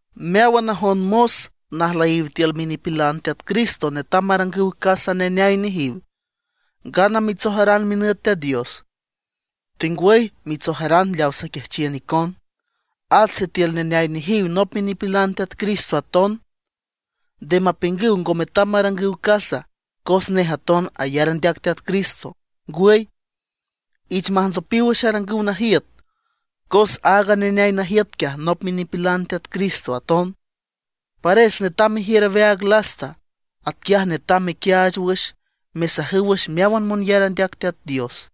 Meáwan najon mos najlüyiw tiül minipilan Teat Cristo netam marangüw casa neneay nejiw, ngana mitsojaran minüt Teat Dios, tengwüy mitsojaran leaw saquiajchiün icon. At sitiül neneay nejiw nop minipilan Teat Cristo aton, nde mapiüngüw ngo metam marangüw casa cos nej aton ayar andeac Teat Cristo. Ngwüy, ich majntsopiw wüx arangüw najiüt, cos aaga neneay najiüt quiaj nop minipilan Teat Cristo aton; pares netam mejiür aweaag lasta. Atquiaj netam mequiaach wüx, mesajüw wüx meáwan monyar andeac Teat Dios.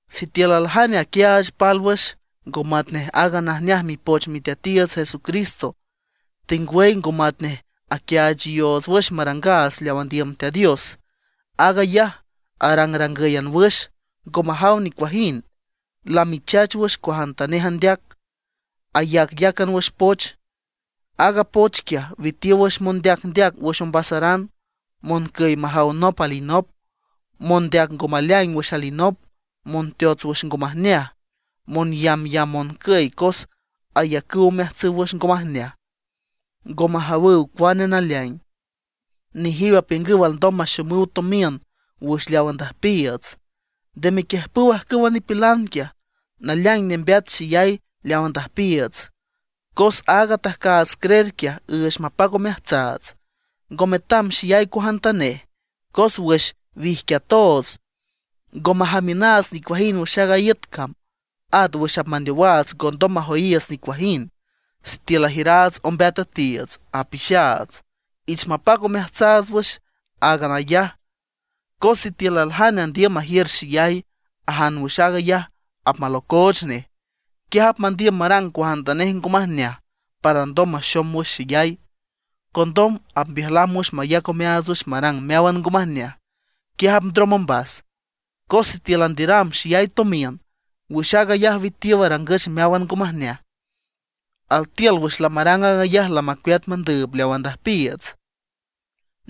Sitiül aljane aquiaach pálwüx, ngo matnej aaga najneaj Mipoch Miteatiiüts Jesucristo, tengwüy ngo matnej aquiaachayoots wüx marangaats leaw andiüm Teat Dios; aag ayaj, arangrangǘyan wüx, ngo majaw nicuajind. Lamichach wüx cuajantanej andeac, ayacyácan wüx poch. Aaga poch quiaj witiow wüx mondeacndeac wüx ombasaran, moncüy majaw nop alinop, mondeac ngo maleaing wüx alinop, monteots wüx ngo majneaj, monyambyamb moncüy cos ayacüw omeajtsüw wüx ngo majneaj, ngo majawüw cuane naleaing. Nejiw apiüngüw alndom maxomüw tomiün wüx leaw andüjpiiüts. Nde mequiüjpüw ajcüwa nipilan quiaj. Naleaing nembeat xeyay leaw andüjpiiüts, cos aaga atajcaats creer quiaj üüch mapac omeajtsaats, ngo metam xeyay cuajantanej. Cos wüx wijquiatoots ngo majamiünaats nicuajind wüx aaga iüt cam; at wüx apmandeowaats ngondom majoyiiüts nicuajind. Sitiül ajiüraats ombeat üetiiüts, apixaats, ich mapac omeajtsaats wüx áagan ayaj. Cos sitiül aljane andiüm majiür xeyay, ajan wüx aag ayaj apmalocooch nej. Quiaj apmandiüm marang cuajantanej ngo majneaj para alndom maxom wüx xeyay. Condom apmbiüjlam wüx mayac omeaats wüx marang meáwan ngo majneaj; quiaj apndrom ombas. Cos sitiül andiüram xeyay tomiün, wüx aag ayaj witiow arangüch meáwan ngo majneaj. Altiül wüx lamarang aag ayaj lamacueat mandüüb leaw andüjpiiüts.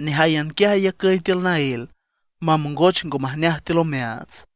Nejáyan quiaj ayacüy tiül naél, mamongoch ngo majneaj tiül omeaats.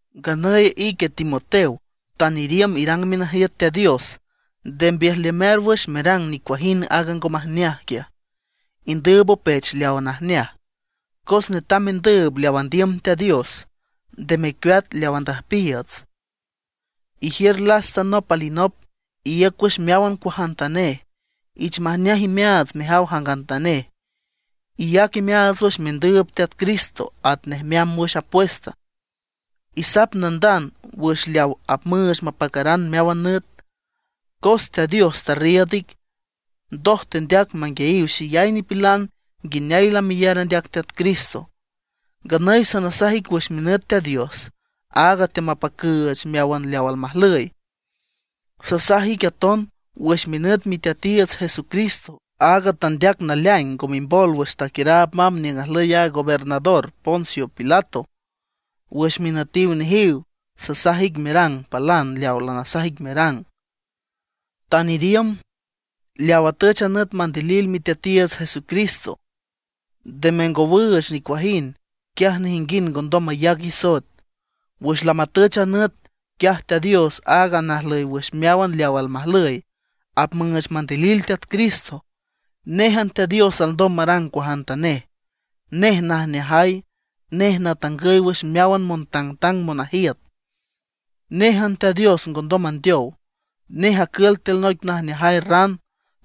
Nganüy ique Timoteo, tan iriümb irang minajiüt Teat Dios, nde mbiüjlamear wüx merang nicuajind aaga ngo majneaj quiaj; indüüb opech leawa najneaj. Cos netam mendüüb leaw andiüm Teat Dios, nde mecueat leaw andüjpiiüts; ijiür lasta nop alinop; iíüc wüx meáwan cuajantanej; ich majneaj imeaats mejaw jangantanej. Iyac imeaats wüx mendüüb Teat Cristo atnej meamb wüx apuesta; isap nandand wüx leaw apmüüch mapacaran meáwan nüt. Cos Teat Dios tarriiüd ic, ndoj tendeac manguiayiw xeyay nipilan nguineay lameyar andeac Teat Cristo. Nganüy sasaj ic wüx minüt Teat Dios, aag teamapacüüch meáwan leaw almajlüy, sasaj ic aton wüx minüt Miteatiiüts Jesucristo, aaga tandeac naleaing ngo mimbol wüx taquiüraab mamb niüng ajlüy a gobernador Poncio Pilato. Wüx minütiw nejiw sasaj ic merang palan leawa lanasaj ic merang, tan iriümb, leaw atüch a nüt mandilil Miteatiiüts Jesucristo. Nde mengowüüch nicuajind, quiaj nejinguind ngondom mayac isoet. Wüx lamatüch a nüt, quiaj Teat Dios, aaga najlüy wüx meáwan leaw almajlüy, apmüüch mandilil Teat Cristo. Néjan Teat Dios alndom marang cuajantanej. Nej najneajay, nej natangüy wüx meáwan montangtang monajiüt. Néjan Teat Dios ngondom mandeow. Nej acül tiül noic najneajay ran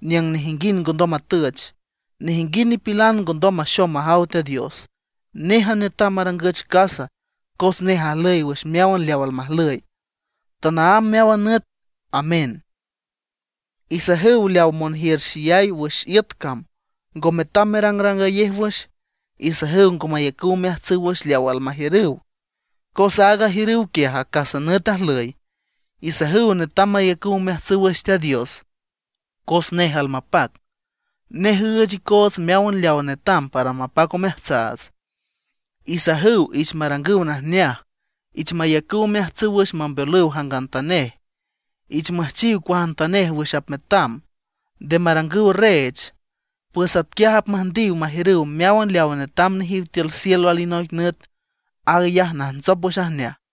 niüng nejinguind ngondom matüch. Nejinguind nipilan ngondom maxom majaw Teat Dios. Néjan netam marangüch casa, cos nej ajlüy wüx meáwan leaw almajlüy, tanaámb meáwan nüt. Amén. Isajüw leawa monjiür xeyay wüx iüt cam, ngo metam merangrangayej wüx; isajüw ngo mayacüw omeajtsüw wüx leaw almajiürüw, cos aaga ajiürüw quiaj acas nüt ajlüy. Isajüw netam mayacüw omeajtsüw wüx Teat Dios, cos nej almapac, nej üüch icoots meáwan leawa netam para mapac omeajtsaats. Isajüw ich marangüw najneaj, ich mayacüw omeajtsüw wüx mambeolüw jangantanej, ich müjchiw cuajantanej wüx apmetam, nde marangüw reech. Pues atquiaj apmüjndiw majiürüw meáwan leaw netam nejiw tiül cielo alinoic nüt, aag ayaj najntsop wüx ajneaj.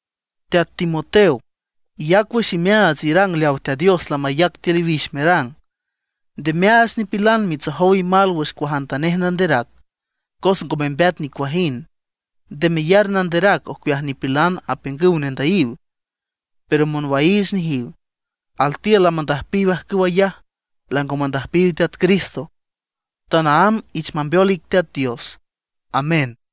Teat Timoteo, iyac wüx imeaats irang leawa Teat Dios lamayac tiül iwix merang. Nde meaach nipilan mitsojow imal wüx cuajantanej nanderac, cos ngo membeat nicuajind. Nde meyar nanderac ocueaj nipilan apiüngüw nendüyiw, pero monwaiich nejiw. Altiül lamandüjpiw ajcüw ayaj, lango mandüjpiw Teat Cristo. Tanaámb ich mambeol ic Teat Dios. Amén.